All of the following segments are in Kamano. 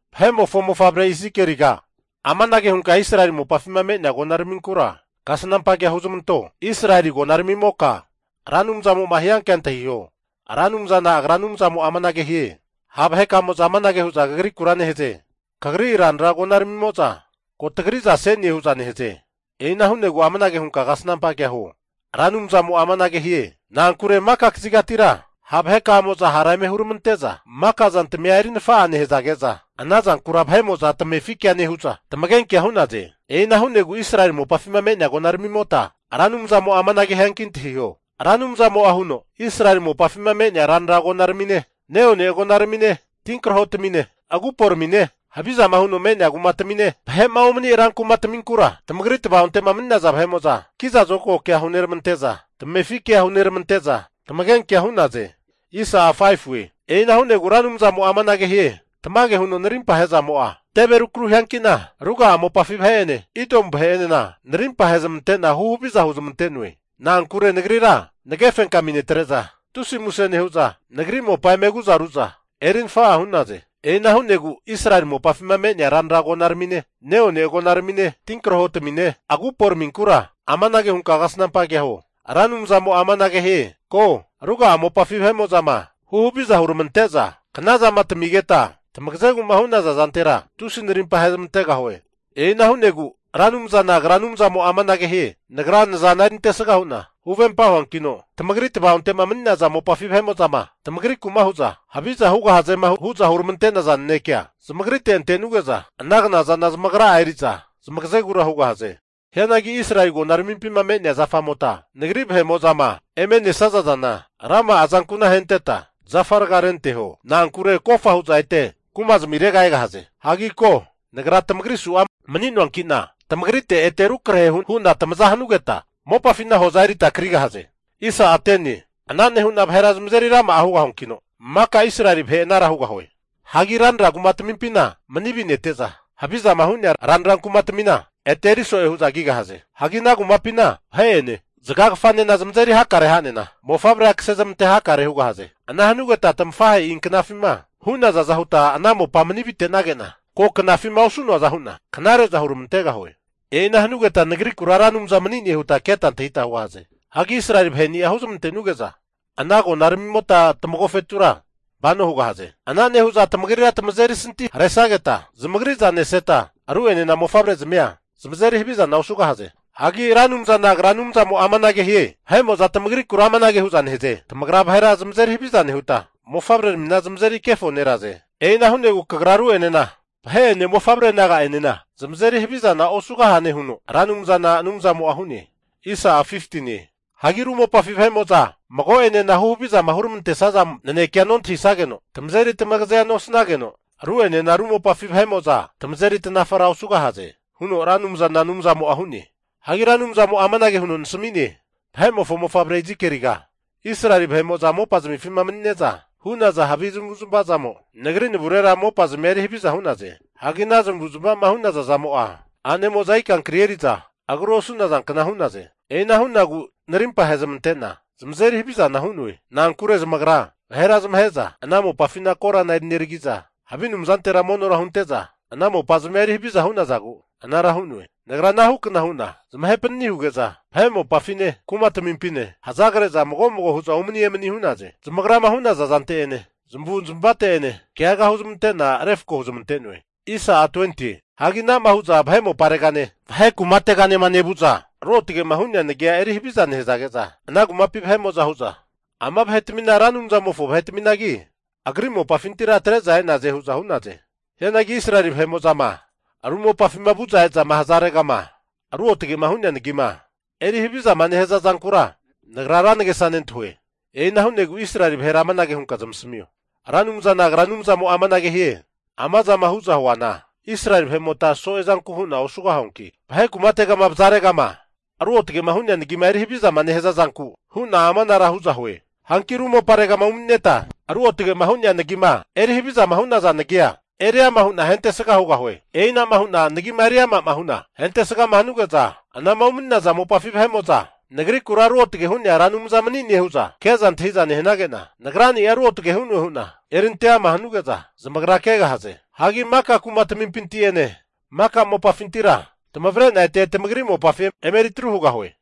Vahe'mofo mofavre Izikieliga, amanage hunka Israeli mopafima me'nea agonaraminkura kasnampa kea huzmanto, Israeli agonaramimoka Ra Anumzamo'ma hiankea antahiho. Ra Anumzana Agra Anumzamo'a amanage hie, Ha' vahekamo'za amanage hu'za kagrikura nehaze, kagri ranra agonaramimo'za ko tagri'za se'ne hu'za nehaze. E'ina hu'negu amanage hunka kasnampa kea huo, Ra Anumzamo'a amanage hie, Na'ankure maka kazigatira ha' vahe'kamo'za hara eme huramante'za maka zantmia eri nafa'a nehazage'za ana zankura vahe'mo'za tamefi kea nehu'za tamagenkea hu'naze. E'ina hu'negu Israeli mopafima me'nea agonaramimota, Ra Anumzamo'a amanage hianki antahiho, Ra Anumzamo'a huno, Israeli mopafima me'nea ranra agonaramine, neone agonaramine tinkrahotamine, aguporamine, havizama huno me'nea kumatamine, vahe'ma omani rankumataminkura tamagri tava'ontema mani'naza vahe'mo'za kiza zokago kea huneramante'za, tamefi kea huneramante'za, tamagenkea hu'naze. E'ina hu'negu Ra Anumzamo'a amanage hie, Tamage huno narimpa ahe'zamo'a teve rukru hiankina, ruga'a mopafi vahe'ene Idomu vahe'enena narimpa ahezmante'na huhaviza huzmante'noe. Na'ankure Nagrira nage fenkami netre'za, tusi muse nehu'za nagri mopa eme aguza ru'za eri nafa'a hu'naze. E'ina hu'negu Israeli mopafima me'nea ranra agonaramine, neone agonaramine, tinkrahotamine, aguporaminkura amanage hunka kasnampa kea huo, Ra Anumzamo'a amanage hie, Ko, ruga'a mopafi vahe'mo'zama huhaviza huneramante'za knazama tamigeta tamagazegu'ma hu'naza zantera, tusi narimpa ahezmantegahue. E'ina hu'negu Ra Anumzana Agra Anumzamo'a amanage hie, Nagra nazana erintesaga hu'na huvempa huankino, tamagri tava'onte'ma mani'naza mopafi vahe'mo'zama tamagriku'ma hu'za, haviza hugahazema hu'za huramante'naza nanekea, zamagrite antenuge'za ana knazana zamagra'a eri'za zmagazegura hugahaze. Hianagi Israeli agonaramimpima me'nea zafamota Nagri vahe'mo'zama eme nesaza zana rama'a azanku'na ahenteta zafa raga'a renteho. Na'ankure kofa hu'za ete kumazmirera egahaze. Hagi ko, Nagra tamagri su'a mani'noanki'na tamagrite ete rukrahe hu'na tamaza hanugeta mopafina hoza erita krigahaze. Ana nehu'na vahera zamazeri rama'a hugahuankino, maka Israeli vahe anara hugahue. Hagi ranra kumatmimpina mani avi'nete'za havizama hu'nea ranra kumatamina ete eri so'e hu'za kigahaze. Hagi ana kumapina vahe'ene zagagafanena zamazeri hakare ha'nena mofavrea kasezmante hakare hugahaze. Ana hanugeta tamafahe'i knafima hu'nazaza huta ana mopa mani vinetenage'na, ko knafima osu'noaza hu'na knare'za huramantegahue. E'ina hanugeta Nagrikura Ra Anumza mani'ne huta keta antahita hugahaze. Hagi Israeli vahe'ni'a huzmantenuge'za ana agonaramimota tamagofetura vano hugahaze. Ana nehu'za tamagrira tamazeri santi haresageta, zamagri'za neseta ru'enena mofavrezmia zamazeri havizana osugahaze. Hagi Ra Anumzana Agra Anumzamo'a amanage hie, Vahe'mo'za tamagrikura amanage hu'za nehaze, tamagra vahera zamazeri haviza nehuta, mofavreramina zamazeri kefoneraze. E'ina hu'negu kagra ru'enena, vahe'ene mofavre naga'enena zamazeri havizana osugahane huno Ra Anumzana Anumzamo'a hu'ne. Hagi ru mopafi vahe'mo'za mago'enena huhavizama huramante'naza nanekea nontahisageno, tamazeri tamagazea nosanageno, ru'enena ru mopafi vahe'mo'za tamazeri tanafara osugahaze huno Ra Anumzana Anumzamo'a hu'ne. Hagi Ra Anumzamo'a amanage huno nasami'ne, Vahe'mofo mofavre Izikieliga, Israeli vahe'mo'za mopazmifima mani'neza hu'naza havi zamavu'zmava zamo, Nagri navurera mopazmia eri haviza hu'naze. Hagi ana zamavuzmavama hu'naza zamo'a, a'nemo'za ikankri eri'za agru osu'nazankna hu'naze. E'ina hu'nagu narimpa ahezmante'na zamazeri havizana hu'noe. Na'ankure zamagra vahera zamahe'za ana mopafina korana eri neragi'za, havi anumzantera monora hunte'za, ana mopazmia eri haviza hu'nazagu anara hu'noe. Nagra ana hukna hu'na zamahe panani huge'za, vahe mopafine, kumatamimpine hazagre'za mago mago hu'za umani emani hu'naze. Zamagrama hu'naza zante'ene, zamavu zamavate'ene keaga huzmante'na refko huzmante'noe. Hagi ana'ma huza vahe moparegane, vahe kumategama nevu'za Ruotge'ma hu'nea nagia eri haviza nehazage'za, ana kumapi vahe'mo'za hu'za, ama vahetamina Ra Anumzamofo vahetaminagi, Agri mopafintira atre'za e'naze hu'za hu'naze. Hianagi Israeli vahe'mo'zama ru mopafima vu'za ezama hazaregama ruotge'ma hu'nea nagima eri havizama nehaza zankura, Nagra ra nagesa nentahue. E'ina hu'negu Israeli vahera amanage hunka zamasamio, Ra Anumzana Agra Anumzamo'a amanage hie, Ama zama hu'za huana Israeli vahe'mota so'e zanku hu'na osuanki, vahe kumategama vazaregama ruotge'ma hu'nea nagima eri havizama nehaza zanku hu'na amanara hu'za hue. Hanki ru moparegama umani'neta ruotge'ma hu'nea nagima eri havizama hu'naza nagia eriama hu'na ahentesga hugahue. E'inama hu'na nagima eriama hu'na hentesgama hanuge'za, anama umani'naza mopafi vahe'mo'za Nagrikura Ruotge hu'nea Ra Anumza mani'ne hu'za ke'za antahiza nehanage'na, Nagrani'a ruotge hu'noe hu'na eri ante ama hanuge'za zamagra kegahaze. Hagi maka kumatamimpinti'ene maka mopafintira tamavre'na ete tamagri mopafi emeri atru hugahue.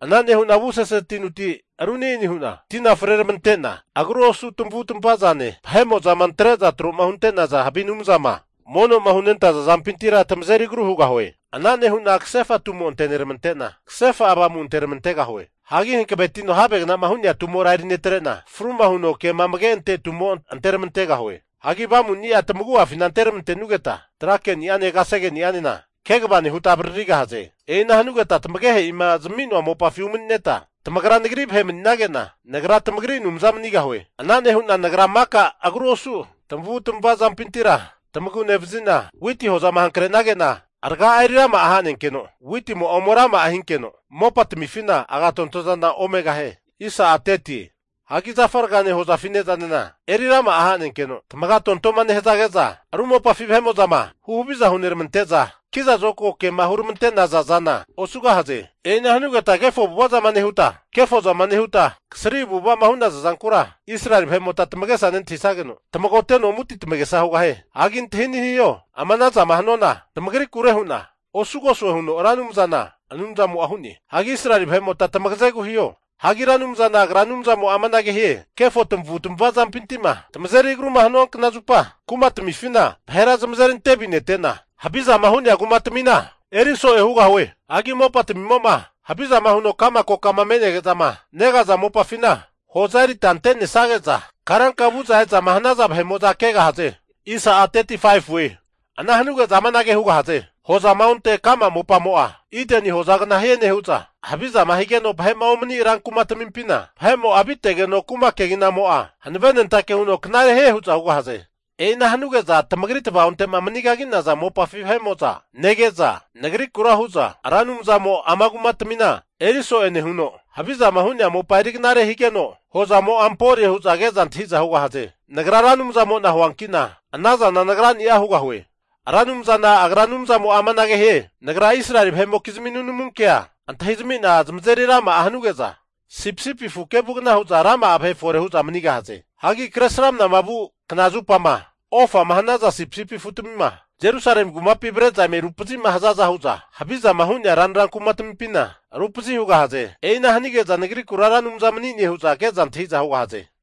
Ana nehu'na avusese tinuti ru ani'ani hu'na tina freramante'na, agru osu tamavutamava zane, vahe'mo'zama antre'za troma hunte'naza havi anumzama mono'ma hunentaza zampintira tamazeri agru hugahue. Ana nehu'na kasefa tumo anteneramante'na, kasefa avamu anteramantegahue. Hagi hankavetino havegna'ma hu'nea tumora erinetre'na, fru'ma huno kema amage ante tumo anteramantegahue. Hagi Avamuni'a tamagu'afina anteramante'nugeta tra ke'ni'ane kasegeni'anena kegava nehuta avaririgahaze. E'ina hanugeta tamagehe'ima zami'noa mopafi umanineta, tamagra Nagri vahe mani'nage'na, Nagra tamagri Anumza manigahue. Ana nehu'na Nagra maka agru osu tamavutmava zampintira tamagu nevazi'na, witi hozama hankre'nage'na, raga'a eri rama'a hanenkeno, witimo'a ome rama'a hinkeno mopatamifina agatontozana omegahie. Hagi zafa ragane hozafi ne'zanena eri rama'a hanenkeno tamagatonto'ma nehazage'za ru mopafi vahe'mo'zama huhaviza huneramante'za kiza zokago kema huramante'naza zana osugahaze. E'ina hanugeta kefo avu'ava zama nehuta, kefo zama nehuta, kasri avu'ava'ma hu'naza zankura, Israeli vahe'mota tamagesa nentahisageno tamagoteno amu'ati tamagesa hugahie. Hagi antahi'neni hiho, ama ana zama hanuana, tamagrikure hu'na osugosue huno Ra Anumzana Anumzamo'a hu'ne. Hagi Israeli vahe'mota tamagazegu hiho. Hagi Ra Anumzana Agra Anumzamo'a amanage hie, Kefo tamavu'tamava zampinti'ma tamazeri agruma hanua kna zupa, kumatmifina vahera zamazeri ante avinetena, havizama hu'nea kumatamina eri so'e hugahue. Hagi mopatimo'ma havizama huno ka'ma kokama menege'zama negaza mopafina hoza erita ante'nesage'za karanka vu'za e'zama hanaza vahe'mo'za kegahaze. Ana hanuge'za amanage hugahaze, hozama onte ka'ma mopamo'a, Ideni hozagna hie nehu'za, havizama higeno vahe'ma omani'nea rankumatamimpina vahe'mo'a avitegeno kuma keginamo'a hanavenentake huno knare hie hu'za hugahaze. E'ina hanuge'za tamagri tava'onte'ma manigagi'naza mopafi vahe'mo'za nege'za, Nagrikura hu'za Ra Anumzamo ama kumatmina eri so'e nehuno, havizama hu'nea mopa eri knare higeno, hozamo'a ampore hu'za ke'za antahi'za hugahaze. Nagra Ra Anumzamo'na huanki'na ana zana Nagrani'a hugahue. Ra Anumzana Agra Anumzamo'a amanage hie, Nagra Israeli vahe'mokizmi nunamu kea antahizami'na zamazeri rama'a hanuge'za, sipisipi afu kevugna hu'za rama'a vahe fore hu'za manigahaze. Hagi Kresramana vu kna zupama ofama hanaza sipisipi afu'tamima Jerusalemi kumapi avre'za eme rupazima hazaza hu'za havizama hu'nea ranra kumatmimpina rupazi hugahaze. E'ina hanige'za Nagrikura Ra Anumza manine hu'za ke'za antahi'za hugahaze.